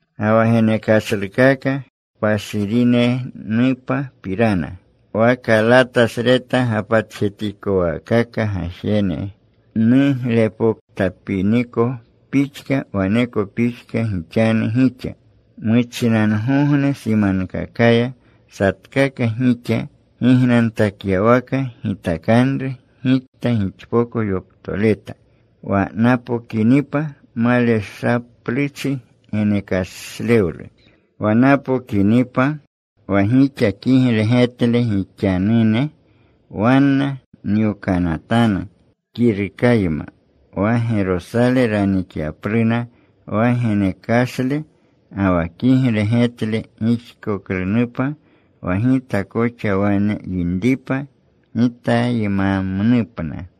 Ga wa genekashlukaka kpashirinenupapirana. Wa Kalatasreta gapatjetikowaakaka gajene nuglepoktapiniko pixka, waneko pixka gixanu gixa. Muchinangogne simankakaya, satkaka gixa gignantakyawaka gitakanru gikta gixpoko yoptoleta. Wa napokinipa maleshapluchi genekashlewlu. Wa napokinipa wa gixa kigle getle gixanune, wanna nyokanatanu kirukayma, wa Gerosale ranikyapluna wa genekashle. Ga wa kigle getle rixkoklunupa wa gita koxa wane yinripa, gitaymamnupna.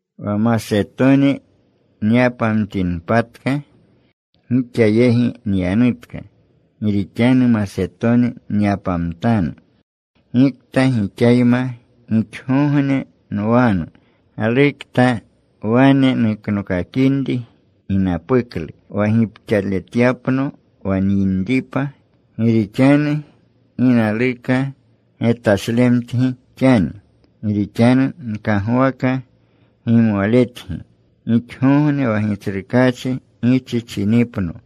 Wa Masetoni nyapamtinpatka, gixa yegi nyanutka. Gi rixanu Masetoni nyapamtanu. Gikta gixayma gixgogne nwanu. Galukta wane nuknokakinri ginapuklu wa gipxaletyapno wa nyinripa. Gi rixanu gi naluka getleshamtgi xani. Gi rixanu nkagwaka gimwaletgi gixgogne wa Gitsrukaachi gichichinipno.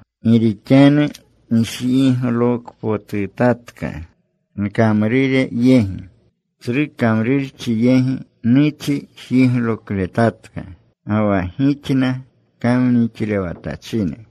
Gi rixanu njiglokpotutatka nkamrure yegi. Tsru kamrurchi yegi nuchi jiglokletatka. Ga wa gixna kamnixlewatachine.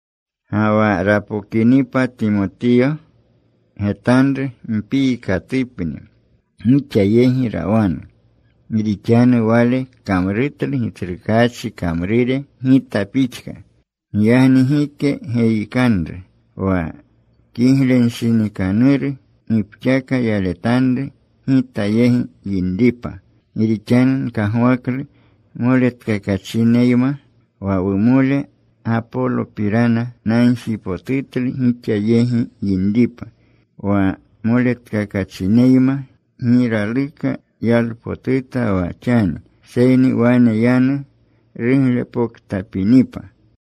Ga wa rapokinipa Timotiyo, getanru mpiikatupni gixa yegi rawanu. Gi rixanu wale kamrutlu Gitsrukaachi kamrure gita pixka. Giyagni gike geyikanru. Wa kiglenshinikanuru gipxaka yaletanru gita yegi runinripa. Gi rixanu nkagwaklu moletkakachineyma. Wa wumole Gapolopirana, nagjipotutlu gixa yegi yinripa wa moletkakachineyma. Gi raluka yalpotuta wa xani, seyni wane yanu ruglepoktapinipa.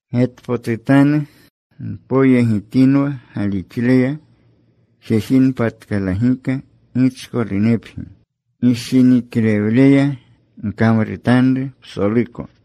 Getpotutanu. Mpoyegitinwa galixleya. Jejinpatkalagika. Gichkolunepgi. Gishiniklewleya gkamrutanru psoluko.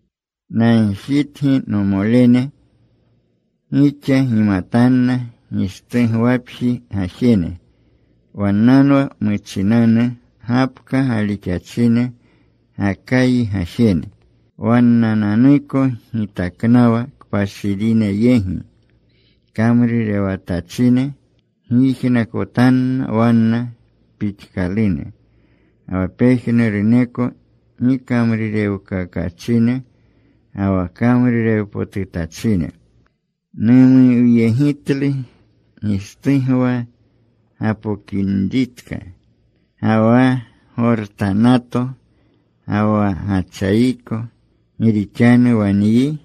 Nagjitgi, nomolene. Gixa gimatanna Gishtugwapji gajene. Wannanwa muchinanu gapka galixachine Gakayi gajene. Wannananuko gitaknawa kpashirine yegi kamrurewatachine. Gyijnakotanna wanna pixkalune, ga wa pejnuruneko gikamrurewkakachine, ga wa kamrurewpotutachine. Numuwyegitlu Gishtugwa gapokinritka, ga wa Gortanato, ga wa Gachayiko. Gi rixanu wa nyi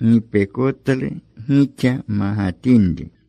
gipekotlu gixa magatinri.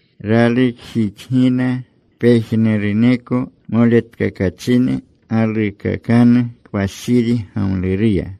Ralukjixgina pejnuruneko moletkakachine. Galuukakanu kpashiri gamluruya.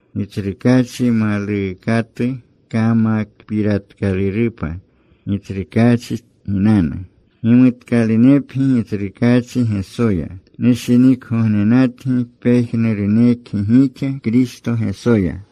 Gitsrukaachi maluukatu kamakpiratkalurupa. Gitsrukaachi ginanu. Gimutkalunepgi Gitsrukaachi Gesoya. Nushinikgognenatgi pejnurunekgi gixa Kristo Gesoya.